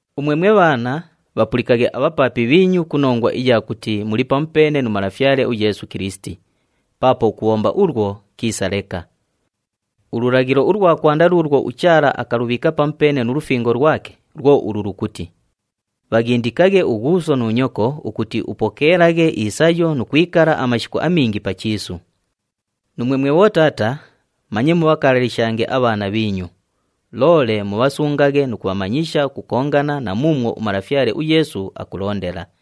Umwe mwe bhaana, bhapulikaghe abhapaapi bhiinyu ku nongwa iya kuti muli pamupeene nu Malafyale uYeesu Kilisiti. Paapo ukubhomba ulwo kiisa leka. Ululaghilo ulwa kwanda luulwo uChaala akalubhiika pamupeene nu lufingo lwake, lwo ulu lukuti, “Bhaghindikaghe ughuuso nu nyoko ukuti upokeelaghe isayo nu kwikala amashiku amingi pa chiisu.” Nuumwe mwe bhotaata, manye mubhakalalishange abhaana bhiinyu, loole mubhasungaghe nu kubhamanyisha ukukongana na muumwo uMalafyale uYeesu akulondela.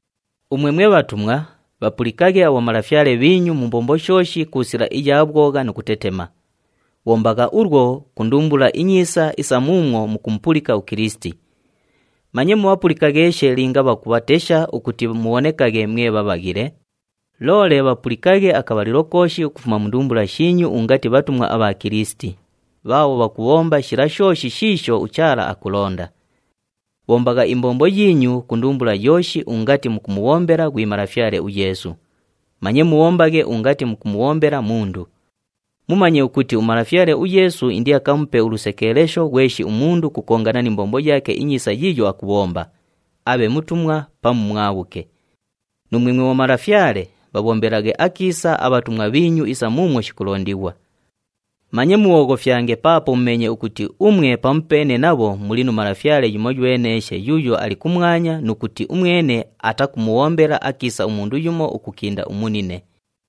Umwe mwe bhatumwa, bhapulikaghe abhomalafyale bhiinyu mu mbombo shooshi ku sila iya bhwogha nu kutetema. Bhombagha ulwo ku ndumbula inyiisa isa muumwo mukumupulika uKilisiti. Manye mubhapulikagheeshe linga bhakubhatesha ukuti mubhonekaghe mwe bhabhaghile, loole bhapulikaghe akabhalilo kooshi ukufuma mu ndumbula shiinyu ungati bhatumwa abha Kilisiti, bhaabho bhakubhomba shila shooshi shiisho uChaala akulonda. Bhombagha imbombo yiinyu ku ndumbula yooshi ungati mukumubhombela ghwi Malafyale uYeesu, manye mubhombaghe ungati mukumubhombela mundu. Mumanye ukuti uMalafyale uYeesu indiakamupe ulusekeelesho ghweshi umundu ukukongana ni mbombo yaake inyiisa yiiyo akubhomba, abhe mutumwa pamu mwabhuke. Nuumwe mwe bhomalafyale, bhabhombelaghe akiisa abhatumwa bhiinyu isa muumwo shikulondighwa. Manye mubhooghofyange paapo mumeenye ukuti umwe pamupeene nabho muli nu Malafyale yumoyweneeshe yuuyo ali kumwanya nu kuti umwene atakumubhombela akiisa umundu yumo ukukinda umunine.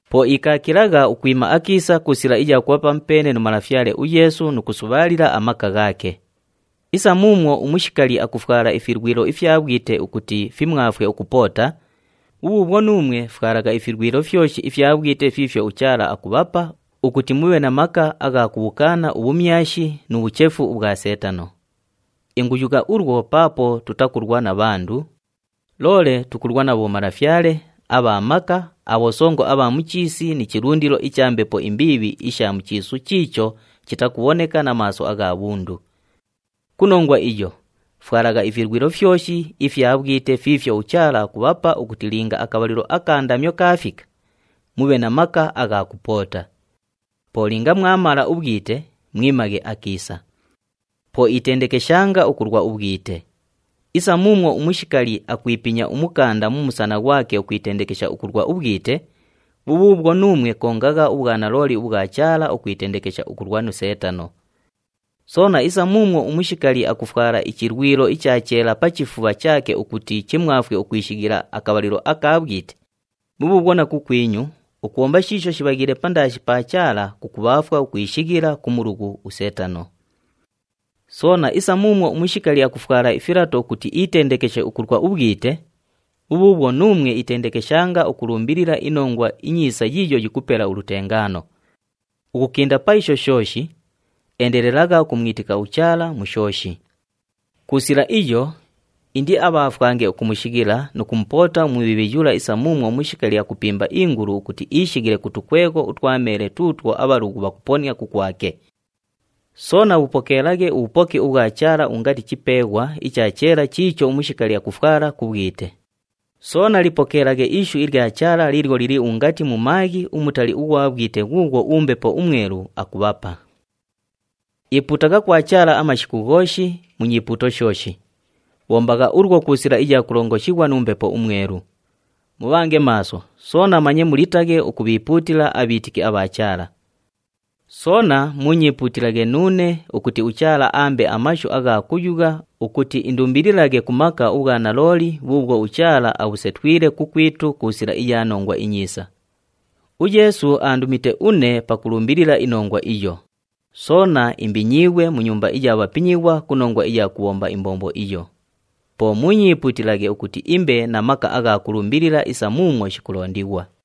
Po ikaakilagha ukwima akiisa ku sila iya kubha pamupeene nu Malafyale uYeesu nu kusubhaalila amaka ghaake. Isa muumwo umushikali akufwala ifilwilo ifya bhwite ukuti fimwafwe ukupoota, bhubhuubhwo nuumwe fwalagha ifilwilo fyoshi ifya bhwite fiifyo uChaala akubhapa ukuti mubhe na maka agha kubhukaana ubhumyashi nu bhuchefu ubhwa Seetano. Inguyugha ulwo paapo tutakulwa na bhandu, loole tukulwa na bhomalafyale, abha maka, abhosongo abha mu chiisi ni chilundilo icha mbepo imbiibhi isha mu chiisu chiicho chitakubhoneka na maaso agha bhundu. Ku nongwa iyo, fwalagha ifilwilo fyoshi ifya bhwite fiifyo uChaala akubhapa ukuti linga akabhalilo aka ndamyo kaafika, mubhe na maka agha kupoota. Po linga mwamala ubhwite, mwimaghe akiisa. Po itendekeshanga ukulwa ubhwite. Isa muumwo umushikali akwipinya umukanda mu musana ghwake ukwitendekesha ukulwa ubhwite, bhubhuubhwo, nuumwe kongagha ubhwanalooli ubhwa Chaala ukwitendekesha ukulwa nu Seetano. Soona isa muumwo umushikali akufwala ichilwilo icha cheela pa chifubha chaake ukuti chimwafwe ukwishighila akabhalilo aka bhwite, bhubhuubhwo na kukwinyu, ukubhomba shiisho shibhaghiile pandaashi pa Chaala kukubhaafwa ukwishighila ku mulughu uSeetano. Soona isa muumwo umushikali akufwala ifilato ukuti itendekeshe ukulwa ubhwite, bhubhuubhwo, nuumwe itendekeshanga ukulumbilila iNongwa iNyiisa yiiyo yikupela ulutengaano. Ukukinda pa isho shooshi, endelelagha ukumwitika uChaala mu shooshi. Ku sila iyo, indiabhaafwange ukumushighila nu kumupoota uMubhiibhi yula isa muumwo umushikali akupimba iingulu ukuti ishighile ku tukwegho utwa meele tuutwo abhalughu bhakuponia kukwake. Soona bhupokeelaghe ubhupoki ubhwa Chaala ungati chipeeghwa icha cheela chiicho umushikali akufwala ku bhwite, soona lipokeelaghe ishu ilya Chaala liilyo lili ungati mumaaghi umutali ughwa bhwite ghuughwo uMbepo uMwelu akubhapa. Ipuutagha kwa Chaala amashiku ghooshi mu nyipuuto shooshi. Bhombagha ulwo ku sila iya kulongoshighwa nu Mbepo uMwelu. Mubhange maaso, soona manye mulitaghe ukubhiipuutila abhiitiki abha Chaala. Soona muunyiipuutilaghe nuune ukuti uChaala aambe amashu agha kuyugha, ukuti indumbililaghe ku maka ubhwanalooli bhuubhwo uChaala abhusetwile kukwitu ku sila iya Nongwa iNyiisa. UYeesu aandumite une pakulumbilila inongwa iyo, soona imbinyiighwe mu nyumba iya bhapinyighwa ku nongwa iya kubhomba imbombo iyo. Po muunyiipuutilaghe ukuti imbe na maka agha kulumbilila isa muumwo shikulondighwa.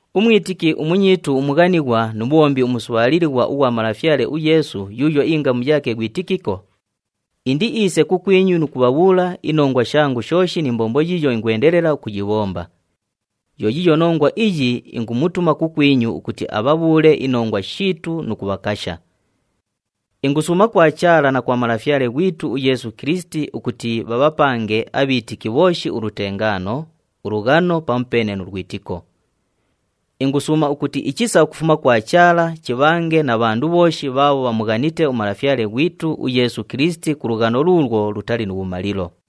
Umwitiki umunyiitu umughanighwa nu mubhombi umusubhaalilighwa ughwa Malafyale uYeesu yuuyo ingamu yaake ghwi Tikiko, indiiise kukwinyu nu kubhabhuula inongwa shangu shooshi ni mbombo yiiyo ingwendelela ukuyibhomba. Yo yiiyo nongwa iyi ingumutuma kukwinyu ukuti abhabhuule inongwa shiitu nu kubhakasha. Ingusuuma kwa Chaala na kwa Malafyale ghwitu uYeesu Kilisiti ukuti bhabhapange abhiitiki bhooshi ulutengaano, ulughano pamupeene nu lwitiko. Ingusuuma ukuti ichisa ukufuma kwa Chaala chibhange na bhandu bhooshi bhaabho bhamughanite uMalafyale ghwitu uYeesu Kilisiti ku lughano luulwo lutali nu bhumalilo.